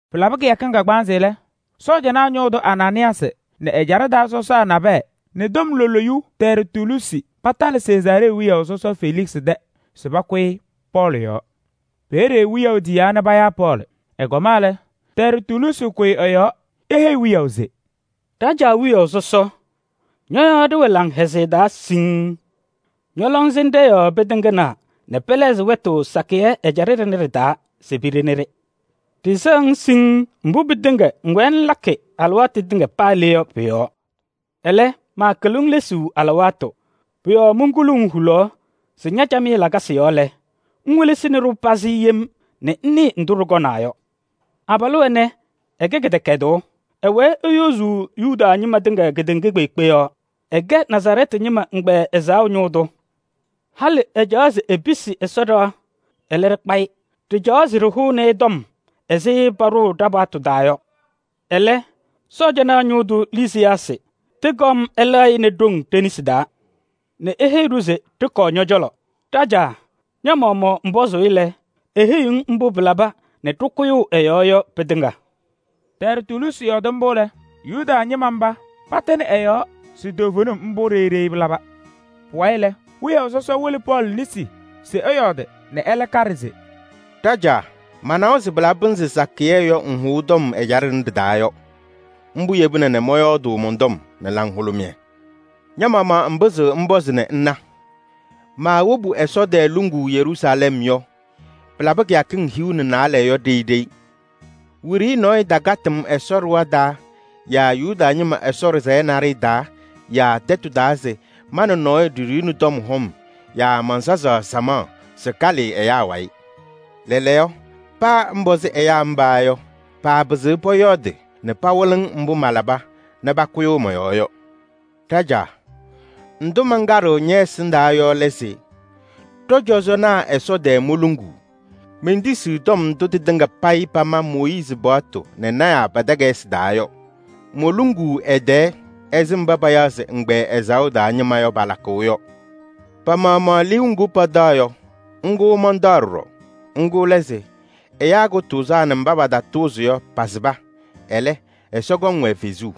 Pɩlabɩ kɩyakɩŋ kagbaanzɩ lɛ, cɔjɔnaa ñʋʋ tʋ Anaanɩyaasɩ nɛ ɛjaɖɛ taa sɔsaa nabɛyɛ nɛ tɔm loluyu Tɛrtuluusi patalɩ Sezaaree wiyaʋ sɔsɔ Feliksɩ tɛ se pakʋyɩ Pɔɔlɩ yɔɔ. Peeye wiyaʋ tiyaa nɛ payaa Pɔɔlɩ. Ɛkɔma lɛ, Tɛrtuluusi kʋyɩ ɛ-yɔɔ: eheyi wiyaʋ se: “Ɖajaa wiyaʋ sɔsɔ! Ñɔ-yɔɔ ɖɩwɛ laŋhɛzɩyɛ taa siŋŋ. Ñɔ-lɔŋsɩnɖɛ yɔɔ pɩtɩŋnaa nɛ pɛlɛɣzɩ wɛtʋ sakɩyɛ ɛjaɖɛ ɖɩnɛ ɖɩ-taa se piɖeni-ɖɩ. Ɖɩsɛɣ-ŋ siŋŋ mbʋ pɩtɩŋa ŋwɛɛ ŋlakɩ alɩwaatʋ tɩŋa paa le yɔ pʋ-yɔɔ. Ɛlɛ, maakɩlɩɣ-ŋ lesuu alɩwaatʋ. Pʋ-yɔɔ monkuluu-ŋ hulaɣ se ña-camɩyɛ lakasɩ yɔɔ lɛ, ŋwelesini-ɖʋ pazɩ yem nɛ ŋnɩɩ ndʋ ɖɩkɔmnaa yɔ. Abalʋ ɛnɛ, ɛkɛ kɩdɛkɛdʋʋ: ɛwɛɛ eyozuu Yuda ñɩma tɩŋa kedeŋa kpeekpe yɔɔ. Ɛkɛ Nazarɛɛtɩ ñɩma ɛgbɛyɛ ɛzaɣʋ ñʋʋ tʋ. Halɩ ɛcaɣaɣ se episi Ɛsɔ ɖɩɣa, ɛlɛ ɖɩkpa-ɩ. [Ɖɩcaɣaɣ se ɖɩhʋnɩ-ɩ tɔm ɛzɩ paɖʋʋ ɖa-paɣtʋ taa yɔ. Ɛlɛ, Sɔɔjanaa ñʋʋ tʋ Lisiyaasɩ tɩkɔm ɛlɛɣ-ɩ nɛ ɖoŋ ɖe-nesi taa nɛ eheyi-ɖʋ se ɖɩkɔɔ ñɔ-cɔlɔ.] Ɖajaa, ña-maɣmaɣ ŋpɔzʋʋ-ɩ lɛ, eheyiɣ-ŋ mbʋ pɩlaba nɛ ɖɩkʋyʋʋ ɛ-yɔɔ yɔ pɩtɩŋa.” Tɛrtuluusi yɔɔdɩ mbʋ lɛ, Yuda ñɩma mba patɩnɩ ɛ-yɔɔ se toovenim mbʋ ɖeyi ɖeyi pɩlaba. Pʋwayɩ lɛ, wiyaʋ sɔsɔ wɩlɩ Pɔɔlɩ nesi se ɛyɔɔdɩ nɛ ɛlɛ kaɖɩ se: “Ɖajaa, manawa se pɩnzɩ sakɩyɛ yɔ ŋhʋʋ tɔm ɛjaɖɛ ɖɩnɛ ɖɩ-taa. Mbʋ yebina nɛ mɔyɔɔdʋʋ mɔn-tɔm nɛ laŋhʋlʋmɩyɛ. Ña-maɣmaɣ ŋpɩzɩɣ ŋpɔzɩ nɛ ŋna, maawobu Ɛsɔ tɛɛ luŋuu Yeruusalɛm yɔ, pɩtɛɖɛɛ kɩyakɩŋ hiu nɛ naalɛ. Wiɖiyi nɔɔyʋ takatɩ-m Ɛsɔ ɖɩɣa taa yaa Yuda ñɩma Ɛsɔ ɖɩsɛyɛ naɖɩyɛ taa yaa tɛtʋ taa se ma nɛ nɔɔyʋ ɖiɖiɣni tɔm hɔm yaa mansazaɣ samaɣ se kalɩɩ ɛyaa wayɩ. Lɛɛlɛɛyɔ, paa ŋpɔzɩ ɛyaa mba yɔ, paapɩzɩɣ pɔyɔɔdɩ nɛ pawɩlɩ-ŋ mbʋ malaba nɛ pakʋyʋʋ mɔ-yɔɔ yɔ. Ɖajaa, ndʋ mankaɖɩɣ ñɛ-ɛsɩndaa yɔ lɛ se: ɖɔ-cɔzɔnaa Ɛsɔ tɛɛ moluŋuu, mentisiɣ tɔm ndʋ tɩtɩŋa payɩ pama Mooyiizi paɣtʋ nɛ lɔɔyɩsɩ tɩnaa pa-takayɩsɩ taa yɔ. Moluŋuu ɛ-tɛɛ ɛzɩ mba payaɣ se ɛgbɛyɛ ɛzaɣʋ yɔ palakʋʋ yɔ. Pa-maɣmaɣ liu ŋgʋ pataɣ yɔ, ŋgʋ mantaɣ ɖɔɖɔ. Ŋgʋ lɛ se: ɛyaa kʋtʋʋzaa nɛ kɩtatʋʋzɩŋ mba pasɩba yɔ, pɔkɔŋ fem.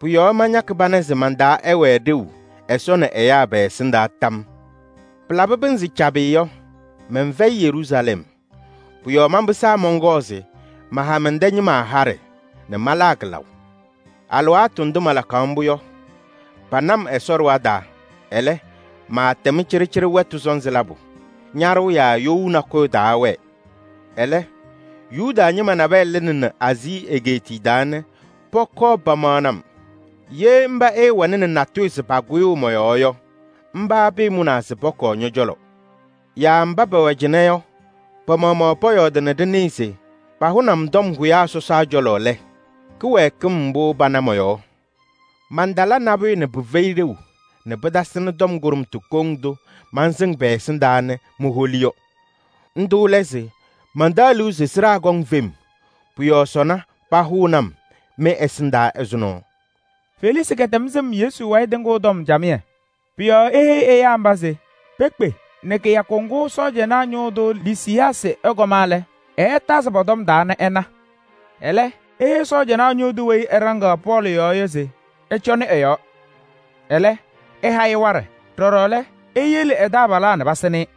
Pʋ-yɔɔ mañakɩ pana se man-taa ɛwɛɛ ɖeu Ɛsɔ nɛ ɛyaa pɛ-ɛsɩndaa tam yɔɔ. Pɩlabɩ pɩnzɩ cabɩ yɔ, mɛnfɛyɩ Yeruusalɛm. Pʋ-yɔɔ manpɩsaa mɔnkɔɔ se maha mɛn-tɛ ñɩma haɖɛ nɛ malaa kɩlaʋ. Alɩwaatʋ ndʋ malakaɣ mbʋ yɔ, pana-m Ɛsɔ ɖɩɣa taa, ɛlɛ, maatɛm cɩɖɩcɩɖɩ wɛtʋ sɔnzɩ labʋ. Ñaɖʋʋ yaa you nakʋyʋ taawɛɛ. Ɛlɛ, Yuda ñɩma nabɛyɛ lɩnɩnɩ Aazii egeetiye taa nɛ pɔkɔɔ pamaɣnɩ-m. Ye mba ɛɛwɛnɩnɩ natʋyʋ se pakʋyʋʋ mɔ-yɔɔ yɔ, mba pɩɩmʋnaa se pɔkɔɔ ñɔ-cɔlɔ. Yaa mba pɛwɛ cɩnɛ yɔ, pa-maɣmaɣ pɔyɔɔdɩ nɛ ɖɩnɩɩ se pahʋnɩ-m tɔm hʋyaa sɔsaa cɔlɔ lɛ, kɩwɛɛkɩm mbʋ pana mɔ-yɔɔ? Mantala nabʋyʋ nɛ pɩfɛyɩ ɖeu nɛ pɩtasɩnɩ tɔm kʋɖʋmtʋ kɔŋ ndʋ mansɩŋ pɛ-ɛsɩndaa nɛ moholi yɔ. Ndʋ lɛ se: ‘Mantaɣ liu se sɩɖaa kɔŋ fem. Pʋ-yɔɔ sɔnɔ pahʋʋnɩ-m mɩ-ɛsɩndaa ɛzʋnɔ.’” Feliksɩ kɛtɛm sɩm Yesu wayɩ tɩŋʋʋ tɔm camɩyɛ. Pʋ-yɔɔ eheyi ɛyaa mba se pekpe nɛ kɩyakʋ ŋgʋ sɔɔjanaa ñʋʋ tʋ Lisiyaasɩ ɛkɔma lɛ, ɛɛtazɩ pɔ-tɔm taa nɛ ɛna. Ɛlɛ eheyi sɔɔjanaa ñʋʋ tʋ weyi ɛɖaŋaɣ Pɔɔlɩ yɔɔ yɔ se ɛcɔnɩ ɛ-yɔɔ, ɛlɛ, ɛha-ɩ waɖɛ. Ɖɔɖɔ lɛ, eyele ɛ-taabalaa nɛ pasɩnɩ-ɩ.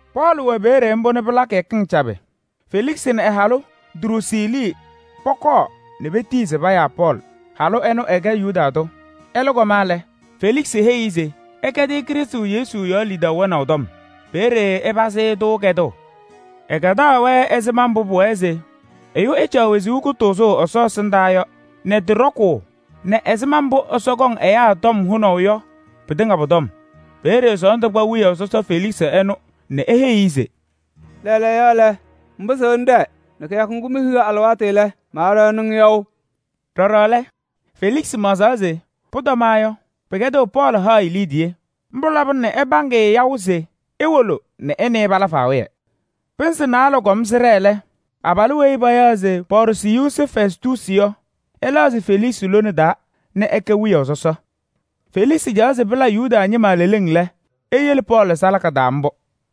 Pɔɔlɩ wɛ peeye mbʋ nɛ pɩla kɩyakɩŋ cabɩ lɛ, Feliksɩ nɛ ɛ-halʋ Druusiili pɔkɔɔ nɛ etiyi se payaa Pɔɔlɩ. Halʋ ɛnʋ ɛkɛ Yuda tʋ. Ɛlɛ kɔma lɛ, Feliksɩ heyi-i se ɛkɛdɩ-ɩ Krɩstʋ Yesu yɔɔ lidaʋ wɛnaʋ tɔm. Peeye ɛpazɩ-ɩ-tʋ kɛdʋʋ. Ɛkɛdaɣ-wɛ ɛzɩma mbʋ pʋwɛɛ se ɛyʋ ɛcaɣ wezuu kʋtʋʋzʋʋ Ɛsɔ ɛsɩndaa yɔ nɛ tɩ ɖɔkʋʋ nɛ ɛzɩma mbʋ Ɛsɔ kɔŋ ɛyaa tɔm hʋnaʋ yɔ pɩtɩŋa pʋ-tɔm. Peeye sɔɔndʋ kpa wiyaʋ sɔsɔ Feliksɩ ɛnʋ nɛ eheyi-i se: “Lɛɛlɛɛyɔ, ŋpɩzɩɣ ŋɖɛɛ nɛ kɩyakʋ ŋgʋ mehiɣ alɩwaatʋ lɛ, maaɖaɣnɩ-ŋ yaʋ.” Ɖɔɖɔ lɛ, Feliksɩ maɣzaɣ se pʋtɔmaɣ yɔ, pɩkɛdɩɣ Pɔɔlɩ ha-ɩ liidiye. Mbʋ labɩna nɛ ɛpaŋ-ɩ yaʋ se ewolo nɛ ɛ nɛ ɩ pala faawɩyɛ. Pɩnzɩ naalɛ kɔm sɩɖɛɛ lɛ, abalʋ weyi payaɣ se Pɔɔrsiyuusi Fɛstuusi yɔ, ɛlɛɣzɩ Feliksɩ lone taa nɛ ɛkɛ wiyaʋ sɔsɔ. Feliksɩ caɣaɣ se pɩla Yuda ñɩma leleŋ lɛ, eyele Pɔɔlɩ salaka taa mbʋ.